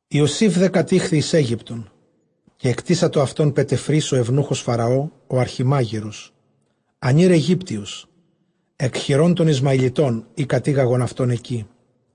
Ἰωσὴφ δὲ κατήχθη εἰς Αἴγυπτον· καὶ ἐκτήσατο αὐτὸν Πετεφρὴς ὁ εὐνοῦχος Φαραὼ, ὁ ἀρχιμάγειρος, ἀνὴρ Αἰγύπτιος, ἐκ χειρῶν τῶν Ἰσμαηλιτῶν, οἳ κατήγαγον αὐτὸν ἐκεῖ.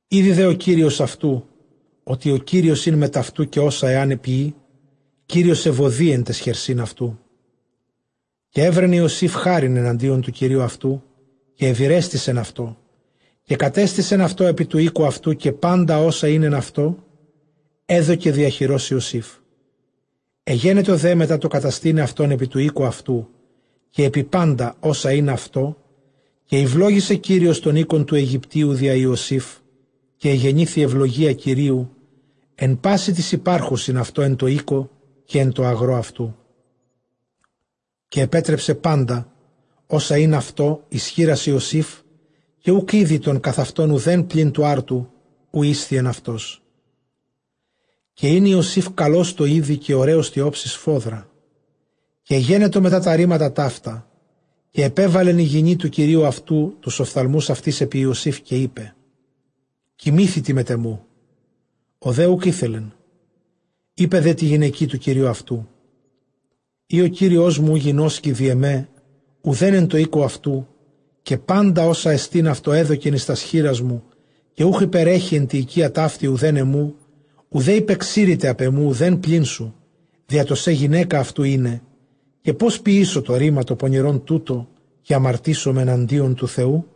Ἤδει δὲ ὁ κύριος αὐτοῦ, ὅτι ὁ Κύριος ἦν μετʼ αὐτοῦ, καὶ ὅσα ἐὰν ποιῇ, Κύριος εὐοδοῖ ἐν ταῖς χερσὶν αὐτοῦ. Καὶ εὗρεν Ἰωσὴφ χάριν ἐναντίον τοῦ κυρίου αὐτοῦ, καὶ εὐηρέστησεν αὐτῷ. Καὶ κατέστησε αὐτὸν ἐπὶ τοῦ οἴκου αὐτοῦ· καὶ πάντα ὅσα ἦν αὐτῷ, ἔδωκε διὰ χειρὸς Ἰωσήφ. Ἐγένετο δὲ μετὰ τὸ καταστῆναι αὐτὸν ἐπὶ τοῦ οἴκου αὐτοῦ, καὶ ἐπὶ πάντα ὅσα ἦν αὐτῷ, καὶ ηὐλόγησε Κύριος τὸν οἶκον τοῦ Αἰγυπτίου διὰ Ἰωσήφ· καὶ ἐγενήθη εὐλογία Κυρίου ἐν πᾶσι τοῖς ὑπάρχουσιν αὐτῷ ἐν τῷ οἴκῳ, καὶ ἐν τῷ ἀγρῷ αὐτοῦ. Καὶ ἐπέτρεψε πάντα ὅσα ἦν αὐτῷ, εἰς χεῖρας Ἰωσήφ· καὶ οὐκ ᾔδει τῶν καθʼ αὑτὸν οὐδὲν, πλὴν τοῦ ἄρτου, οὗ ἤσθιεν αὐτός. Καὶ ἦν Ἰωσὴφ καλὸς τῷ εἴδει, καὶ ὡραῖος τῇ ὄψει σφόδρα. Καὶ ἐγένετο μετὰ τὰ ῥήματα ταῦτα, καὶ ἐπέβαλεν ἡ γυνὴ τοῦ κυρίου αὐτοῦ τοὺς ὀφθαλμοὺς αὐτῆς ἐπὶ Ἰωσήφ· καὶ εἶπεν, κοιμήθητι μετʼ ἐμοῦ. Ὁ δὲ οὐκ ἤθελεν· εἶπε δὲ τῇ γυναικὶ τοῦ κυρίου αὐτοῦ, εἰ ὁ κύριός μου οὐ γινώσκει διʼ ἐμὲ οὐδὲν ἐν τῷ οἴκῳ αὐτοῦ, καὶ πάντα ὅσα ἐστὶν αὐτῷ ἔδωκεν εἰς τὰς χεῖράς μου, καὶ οὐχ ὑπερέχει ἐν τῇ οἰκίᾳ ταύτῆ οὐθὲν ἐμοῦ, οὐδὲ ὑπεξῄρηται ἀπʼ ἐμοῦ οὐδὲν, πλὴν σοῦ, διὰ τὸ σὲ γυναῖκα αὐτοῦ εἶναι, καὶ πῶς ποιήσω τὸ ῥῆμα τὸ πονηρὸν τοῦτο, καὶ ἁμαρτήσομαι ἐναντίον τοῦ Θεοῦ;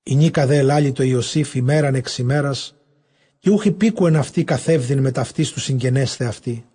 Ἡνίκα δὲ ἐλάλει τῷ Ἰωσὴφ ἡμέραν ἐξ ἡμέρας, καὶ οὐχ ὑπήκουεν αὐτῇ καθεύδειν μετʼ αὐτῆς, τοῦ συγγενέσθαι αὐτῇ.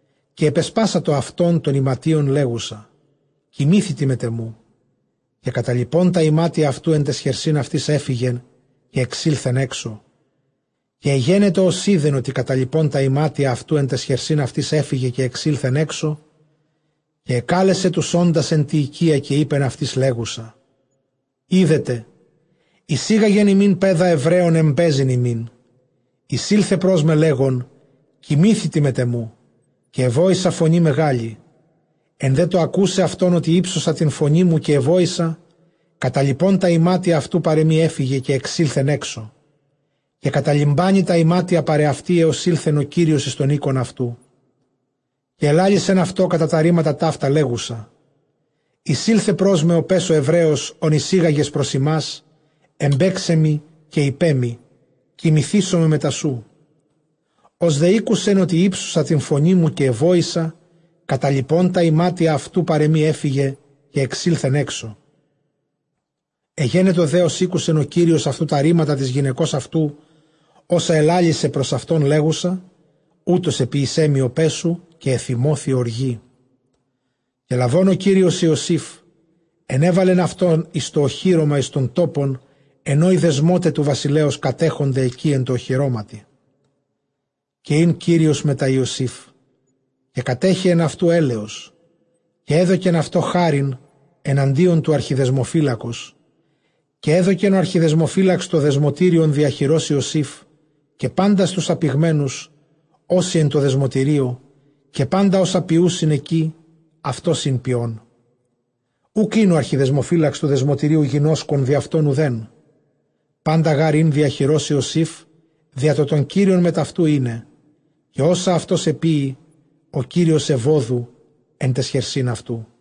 Καὶ ἐπεσπάσατο αὐτὸν τῶν ἱματίων, λέγουσα, κοιμήθητι μετʼ ἐμοῦ· καὶ καταλιπὼν τὰ ἱμάτια αὐτοῦ ἐν ταῖς χερσὶν αὐτῆς ἔφυγε, καὶ ἐξῆλθεν ἔξω. Καὶ ἐγένετο ὡς εἶδεν ὅτι καταλιπὼν τὰ ἱμάτια αὐτοῦ ἐν ταῖς χερσὶν αὐτῆς ἔφυγε, καὶ ἐξῆλθεν ἔξω, καὶ ἐκάλεσε τοὺς ὄντας ἐν τῇ οἰκίᾳ, καὶ εἶπεν αὐτοῖς, λέγουσα, ἴδετε, εἰσήγαγε ἡμῖν παῖδα Ἐβραῖον, ἐμπαίζειν ἡμῖν· εἰσῆλθε πρός με, λέγων, κοιμήθητι μετʼ ἐμοῦ· καὶ ἐβόησα φωνῇ μεγάλῃ. Ἐν δὲ τῷ ἀκοῦσαι αὐτὸν, ὅτι ὕψωσα τὴν φωνήν μου καὶ ἐβόησα, καταλιπὼν τὰ ἱμάτια αὐτοῦ παρʼ ἐμοὶ ἔφυγε, καὶ ἐξῆλθεν ἔξω. Καὶ καταλιμπάνει τὰ ἱμάτια παρʼ ἑαυτῇ, ἕως ἦλθεν ὁ κύριος εἰς τὸν οἶκον αὐτοῦ. Καὶ ἐλάλησεν αὐτῷ κατὰ τὰ ῥήματα ταῦτα, λέγουσα, εἰσῆλθε πρός με ὁ παῖς ὁ Ἑβραῖος, ὃν εἰσήγαγες πρὸς ἡμᾶς, ἐμπαῖξαί μοι· καὶ εἶπέ μοι, κοιμηθήσομαι μετὰ σοῦ. Ὡς δὲ ἤκοῦσεν, ὅτι ὕψωσα τὴν φωνήν μου καὶ ἐβόησα, καταλιπὼν τὰ ἱμάτια αὐτοῦ παρʼ ἐμοὶ ἔφυγε, καὶ ἐξῆλθεν ἔξω. Ἐγένετο δὲ, ὡς ἤκουσεν ὁ κύριος τὰ ῥήματα τῆς γυναικὸς αὐτοῦ, ὅσα ἐλάλησε πρὸς αὐτὸν, λέγουσα, οὕτως ἐποίησέ μοι ὁ παῖς σου, καὶ ἐθυμώθη ὀργῇ. Καὶ λαβὼν ὁ κύριος Ἰωσὴφ, ἐνέβαλε αὐτὸν εἰς τὸ ὀχύρωμα, εἰς τὸν τόπον ἐν ᾧ οἱ δεσμῶται τοῦ βασιλέως κατέχονται ἐκεῖ ἐν τῷ ὀχυρώματι. Καὶ ἦν Κύριος μετὰ Ἰωσὴφ, καὶ κατέχεεν αὐτοῦ ἔλεος· καὶ ἔδωκεν αὐτῷ χάριν ἐναντίον τοῦ ἀρχιδεσμοφύλακος. Καὶ ἔδωκεν ὁ ἀρχιδεσμοφύλαξ τὸ δεσμωτήριον διὰ χειρὸς Ἰωσὴφ, καὶ πάντας τοὺς ἀπηγμένους ὅσοι ἐν τῷ δεσμωτηρίῳ, καὶ πάντα ὅσα ποιοῦσιν ἐκεῖ, αὐτὸς ἦν ποιῶν. Οὐκ ἦν ὁ ἀρχιδεσμοφύλαξ τοῦ δεσμωτηρίου γινώσκον διʼ αὐτὸν οὐθέν· πάντα γὰρ ἦν διὰ χειρὸς Ἰωσὴφ, διὰ τὸ τὸν Κύριον μετʼ αὐτοῦ εἶναι· καὶ ὅσα αὐτὸς ἐποίει, ὁ Κύριος εὐώδο ἐν ταῖς χερσὶν αὐτοῦ.